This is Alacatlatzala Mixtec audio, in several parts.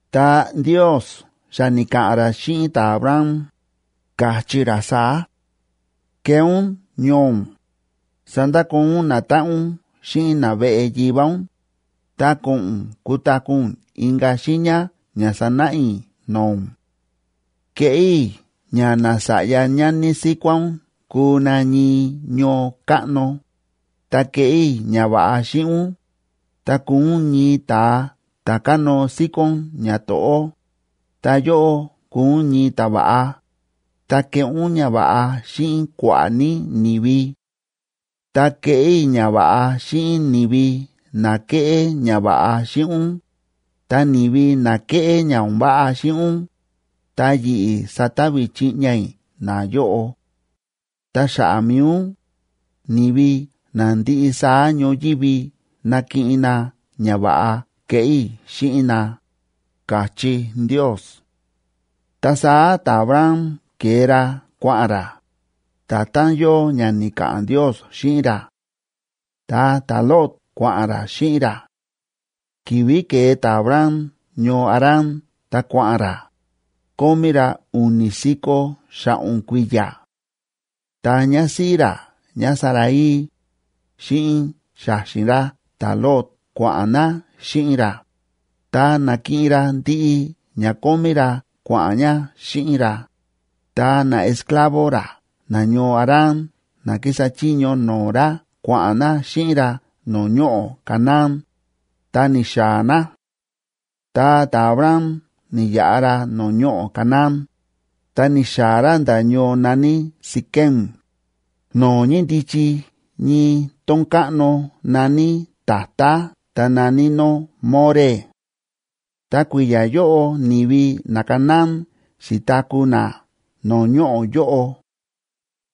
Ta Ndiosa xa ni̱ka̱ꞌa̱n ra xíꞌin ta̱Abram, ka̱chí ra saá: “Kee ún ñoo ún, sandakoo ún natáꞌan ún xíꞌin naveꞌe yivá ún, ta ko̱ꞌo̱n ún kutaku̱ ún inka̱ xiiña ña sanáꞌa i̱ no̱o̱ ún. Keꞌé i̱ ña nasa̱ꞌya ñani síkuá ún kuu na ñii ñoo káꞌno, ta keꞌé i̱ ñava̱ꞌa xíꞌin ún, ta kuu ún ñii ta̱a ta̱ kánóo síkón ñato̱ꞌó, ta yóꞌó kuu ún ñii ta̱va̱ꞌa, ta keꞌé ún ñava̱ꞌa xíꞌin kua̱ꞌa̱ ní ni̱vi. Ta keꞌé i̱ ñava̱ꞌa xíꞌin ni̱vi na kéꞌé ñava̱ꞌa xíꞌin ún, ta ni̱vi na kéꞌé ña o̱n váꞌa xíꞌin ún, ta yi̱ꞌi̱ sata̱vi̱ chiꞌña i̱ nayóꞌo. Ta xa̱ꞌa̱ mi̱i ún, ni̱vi na ndiꞌi saá ñoyívi nakiꞌin na ñava̱ꞌa keꞌé i̱ xíꞌin na”, ka̱chí Ndios. Ta saá ta̱Abram ke̱e ra kua̱ꞌa̱n ra, nda̱tán yóo ña ni̱ka̱ꞌa̱n Ndios xíꞌin ra. Ta ta̱Lot kua̱ꞌa̱n ra xíꞌin ra. Ki̱vi̱ ke̱e ta̱Abram ñoo Harán ta kua̱ꞌa̱n ra, kómí ra u̱ni̱ si̱ko̱ xa̱ꞌo̱n kui̱ya̱. Ta ñásíꞌí ra ñáSarai, xíꞌin xa̱xi̱n ra ta̱Lot kua̱ꞌa̱n na xíꞌin ra, ta na̱kiꞌin ra ndiꞌi ña kómí ra kua̱ꞌa̱n ña xíꞌin ra, ta naesclavo ra nañoo Harán na kísa chiño no̱o̱ ra kua̱ꞌa̱n na xíꞌin ra no̱o̱ ñoꞌo̱ Canaán, ta ni̱xaa̱ na. Ta ta̱Abram ni̱yaꞌa ra no̱o̱ ñoꞌo̱ Canaán, ta ni̱xaa̱ ra nda̱ ñoo na̱ní Siquem, no̱o̱ ñíndichi ñii tón káꞌno na̱ní tatá ta na̱ní nó More. Ta kui̱ya̱ yóꞌo ni̱vi naCanaán xi̱taku̱ na no̱o̱ ñoꞌo̱ yóꞌo.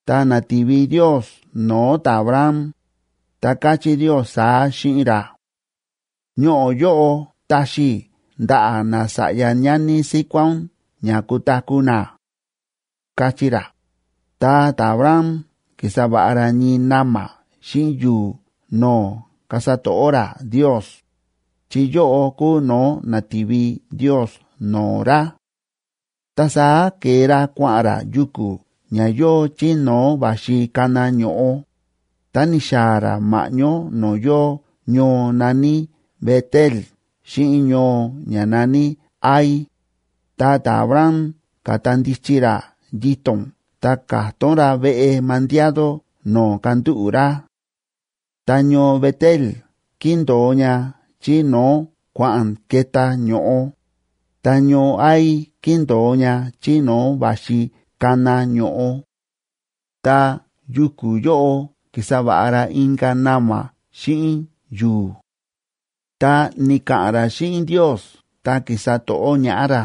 Ta na̱ti̱vi Ndios no̱o̱ ta̱Abram, ta káchí Ndios saá xíꞌin ra: ―Ñoꞌo̱ yóꞌo taxi i̱ ndaꞌa̱ nasa̱ꞌya ñani síkuá ún ña kutaku̱ na ―káchí ra. Ta ta̱Abram ki̱sa va̱ꞌa ra ñii na̱ma̱ xíꞌin yu̱u̱ no̱o̱ kasa to̱ꞌó ra Ndios, chi yóꞌo kúu no̱o̱ na̱ti̱vi Ndios no̱o̱ ra. Ta saá ke̱e ra kua̱ꞌa̱n ra yuku̱ ña yóo chí no̱o̱ va̱xi kana ño̱ꞌo, ta ni̱xaa̱ ra ma̱ꞌñó no̱o̱ yóo ñoo na̱ní Bet‑el xíꞌin ñoo ña na̱ní Hai, ta ta̱Abram ka̱ta ndichi ra yito̱n ta ka̱tón ra veꞌe mandiado no̱o̱ kandúꞌu̱ ra. Ta ñoo Bet‑el kíndo̱o ña chí no̱o̱ kua̱ꞌa̱n ke̱tá ño̱ꞌo, ta ñoo Hai kíndo̱o ña chí no̱o̱ va̱xi kana ño̱ꞌo. Ta yuku̱ yóꞌo ki̱sa va̱ꞌa ra inka̱ na̱ma̱ xíꞌin yu̱u̱, ta ni̱ka̱ꞌa̱n ra xíꞌin Ndios ta ki̱sa to̱ꞌó ñaꞌá ra.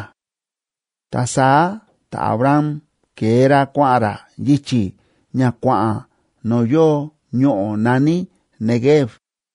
Ta saá ta̱Abram ke̱e ra kua̱ꞌa̱n ra yichi̱ ña kua̱ꞌa̱n no̱o̱ yóo ñoꞌo̱ na̱ní Neguev.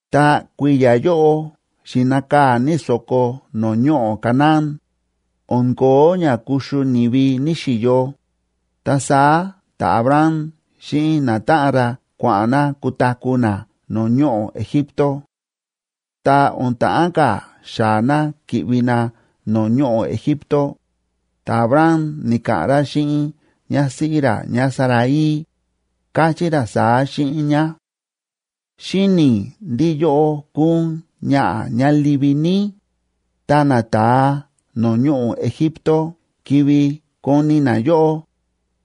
Ta kui̱ya̱ yóꞌo xi̱nakaa̱ ní so̱ko no̱o̱ ñoꞌo̱ Canaán, o̱n ko̱ó ña kuxu ni̱vi ní‑xiyo, ta saá ta̱Abram xíꞌin natáꞌan ra kua̱ꞌa̱n na kutaku̱ na no̱o̱ ñoꞌo̱ Egipto. Ta o̱n ta̱ꞌán ka̱ xaa̱ na ki̱ꞌvi na no̱o̱ ñoꞌo̱ Egipto, ta̱Abram ni̱ka̱ꞌa̱n ra xíꞌin ñásíꞌí ra ñáSarai, káchí ra saá xíꞌin ñá: ―Xíni̱ i̱ ndí yóꞌó kúu ún ñaꞌa̱ ñá livi ní, ta nata̱a no̱o̱ ñoꞌo̱ Egipto ki̱vi̱ koni na yóꞌó,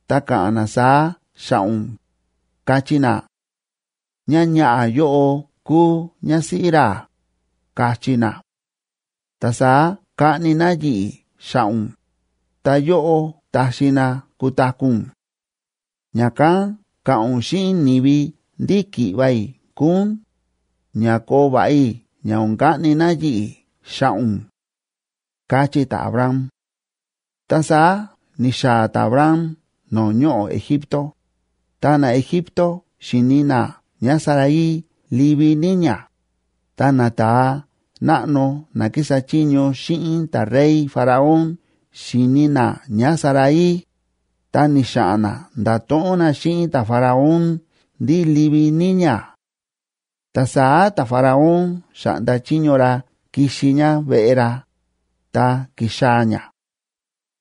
ta ka̱ꞌa̱n na saá xa̱ꞌa̱ ún, kachí na: “Ñáñaꞌa̱ yóꞌo kúu ñásíꞌí ra”, kachí na. Ta saá kaꞌni na yi̱ꞌi̱ xa̱ꞌa̱ ún, ta yóꞌó taxi na kutaku̱ ún. Ña̱kán ka̱ꞌa̱n ún xíꞌin ni̱vi ndí ki̱ꞌva̱ i̱ kúu ún, ña koo va̱ꞌa i̱ ña o̱n kaꞌni na yi̱ꞌi̱ xa̱ꞌa̱ ún ―káchí ta̱Abram. Ta saá ni̱xaa̱ ta̱Abram no̱o̱ ñoꞌo̱ Egipto, ta naEgipto xi̱ni na ñáSarai livi ní ñá. Ta nata̱a náꞌno na kísa chiño xíꞌin ta̱rey Faraón xi̱ni na ñáSarai, ta ni̱xa̱ꞌa̱n na nda̱to̱ꞌon na xíꞌin ta̱Faraón ndí livi ní ñá. Ta saá ta̱Faraón xa̱ꞌnda chiño ra kixi ñá veꞌe ra, ta ki̱xaa̱ ñá.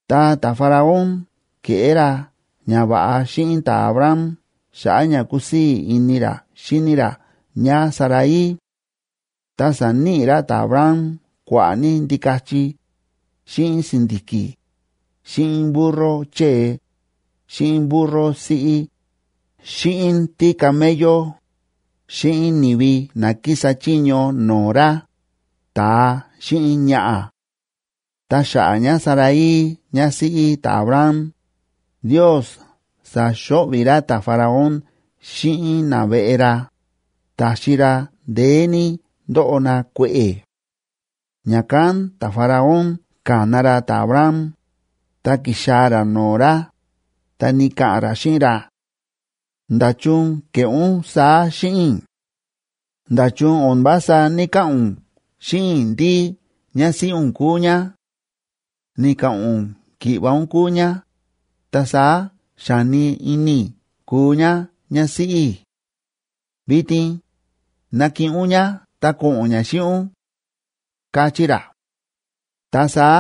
Ta ta̱Faraón ke̱ꞌé ra ñava̱ꞌa xíꞌin ta̱Abram xa̱ꞌa̱ ña kúsii̱ ini ra xíni ra ñáSarai. Ta sa̱níꞌi ra ta̱Abram kua̱ꞌa̱ ní ndikachi, xíꞌin si̱ndi̱ki̱, xíꞌin burro chée, xíꞌin burro siꞌí, xíꞌin tícamello, xíꞌin ni̱vi na kísa chiño no̱o̱ ra, ta̱a xíꞌin ñaꞌa̱. Ta xa̱ꞌa̱ ñáSarai ñásíꞌí ta̱Abram, Ndios sa̱xo̱ꞌvi̱ ra ta̱Faraón xíꞌin naveꞌe ra, ta̱xi ra ndeé ní ndóꞌo na kue̱ꞌe̱. Ña̱kán ta̱Faraón ka̱na ra ta̱Abram, ta ki̱xaa̱ ra no̱o̱ ra, ta ni̱ka̱ꞌa̱n ra xíꞌin ra: ―¿Nda̱chun ke̱ꞌé ún saá xíꞌin i̱? ¿Nda̱chun o̱n vása ní‑kaꞌa̱n ún xíꞌin i̱ ndí ñásíꞌí ún kúu ñá? Ni̱ka̱ꞌa̱n ún ki̱ꞌva̱ ún kúu ñá, ta saá xa̱ni ini i̱ kuu ñá ñásíꞌí i̱. Vitin, ¡ná kiꞌin ún ñá, ta ko̱ꞌo̱n ñá xíꞌin ún! ―káchí ra. Ta saá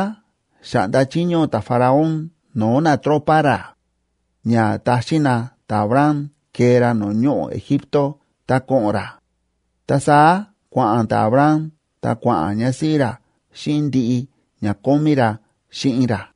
xa̱ꞌnda chiño ta̱Faraón no̱o̱ natropa ra, ña taxín na ta̱Abram kee ra no̱o̱ ñoꞌo̱ Egipto ta ko̱ꞌo̱n ra, ta saá kua̱ꞌa̱n ta̱Abram ta kua̱ꞌa̱n ñásíꞌí ra xíꞌin ndiꞌi ña kómí ra xíꞌin ra.